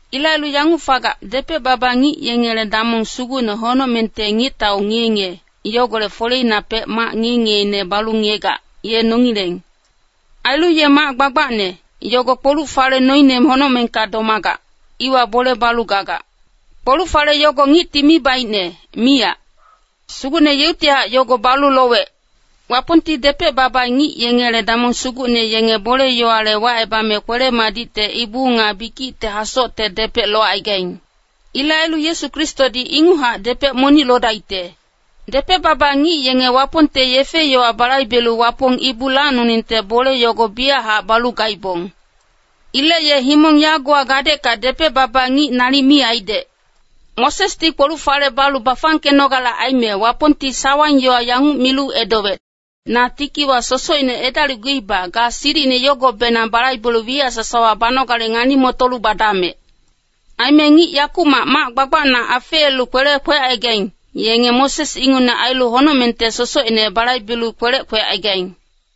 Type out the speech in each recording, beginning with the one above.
Ilec ailu yanguc fagac, depec-baba ngic yengele damong sugucne honocmengte Ngictau ngiye-ngiye, yogolec foleinapec mac ngiye-ngiyeine balu ngiyegac, ye nongileng. Ailu ye mac gbagbacne, yogo kpoluc-fale noine honocmengka domagac, iwa bole balu gagac. Kpoluc-fale yogo ngicti mi baicne, miyac. Sugucne yeuctihac yogo balu lowec. Wapongti depec-baba ngic yengele damong sugucne yenge bole-yowale wacebame kwele-madicte ibu nga bikicte hasocte depec locaigaing. Ilec ailu Yesu Kristodi inguchac depec monic lodaicte. Depec-baba ngic yenge Wapongte yefe-yowa balaibelu Wapong ibu lacnoningte bole yogo biyachac balu gaibong. Ilec ye himong yagowa gadecka depec-baba ngic nalic mi aidec. Mosesdi kpoluc-fale balu bafangkenogale aime, Wapongti sawang-yowa yanguc milu edowec, “Na tikiwa sosocine edalicguiba, ga silicine yogobenang balaibelu wiyac sasawa banogale ngani-motolu badamec.” Aime ngic yakumac mac gbagbacna afeelu kwelec kwecaigaing, yenge Moses ingucne ailu honocmengte sosocine balaibelu kwelec kwecaigaing.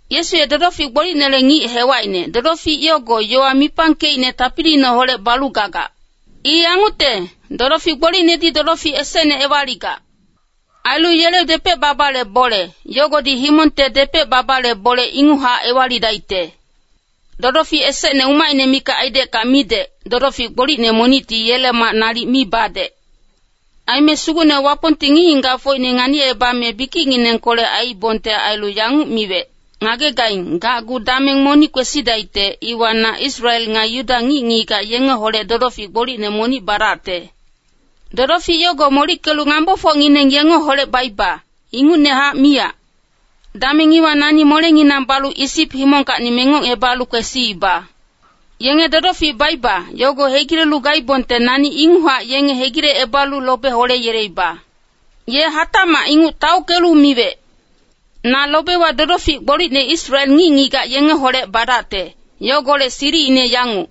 Yesu ye dodofic gbolicnele ngic hewacine, dodofic yogo yowa mipangkeicne tapiliineholec balu gagac. I yangucte, dodofic gbolicnedi dodofic esecne ewaligac. Ailu yele depec-babale bole, yogodi himongte depec-babale bole inguchac ewalidaicte. Dodofic esecne umacine mikac aidecka midec, dodofic gbolicne monicti yele mac nalic mi badec. Aime Sugucne Wapongti ngic-ngigacfocine nganicebame bikicnginengkolec aiibongte ailu yanguc miwec, “Ngagegaing, gacgu dameng monic kwesidaicte, iwa na Israel nga Yuda ngic-ngigac yengeholec dodofic gbolicne monic badacte. Dodofic yogo molickelu ngambofocngineng yengeholec baiba, ingucnehac miyac. Dameng iwa nani molenginang balu Isip himongkacni mengocebalu kwesiiba. Yenge dodofic baiba, yogo hegilelu gaibongte nani inguchac yenge hegilecebalu lobe holeyeleiba.” Ye hatacmac inguc taockelu miwec, “Na lobewa dodofic gbolicne Israel ngic-ngigac yengeholec badacte, yogolec silicine yanguc.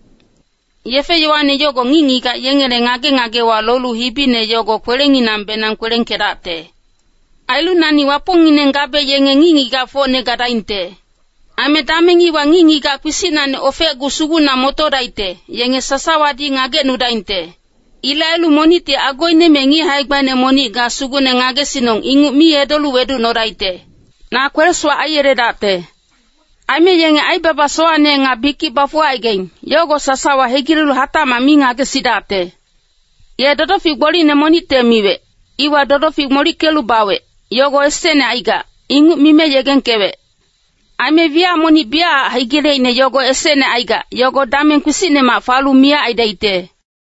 Yefe-yowane yogo ngic-ngigac yengele ngage-ngagewa lolu hibine yogo kwelenginangbenang kwelengkedacte. Ailu nani Wapongngineng gabe yenge ngic-ngigacfocne gadaingte. Aime dameng iwa ngic-ngigac kpisicnacni ofecgu sugucna motodaicte, yenge sasawadi ngagecnudaingte. Ilec ailu monicti agoine me ngic hae-gbaine monic ‘ga Sugucne ngagesinong’ inguc mi edolu weducnodaicte. Na kwele-sowac aiyeledacte. Aime yenge aibaba sowacne nga bikic bafuwagaing, yogo sasawa hegilelu hatacmac mi ngagesidacte.” Ye dodofic gbolicne monicte miwec, iwa dodofic molickelu bawec, yogo esecne aigac, inguc mime yegengkewec. Aime wiyac monic biyachac hegileicne yogo esecne aigac, yogo dameng kpisicnemac falu miyac aidaicte.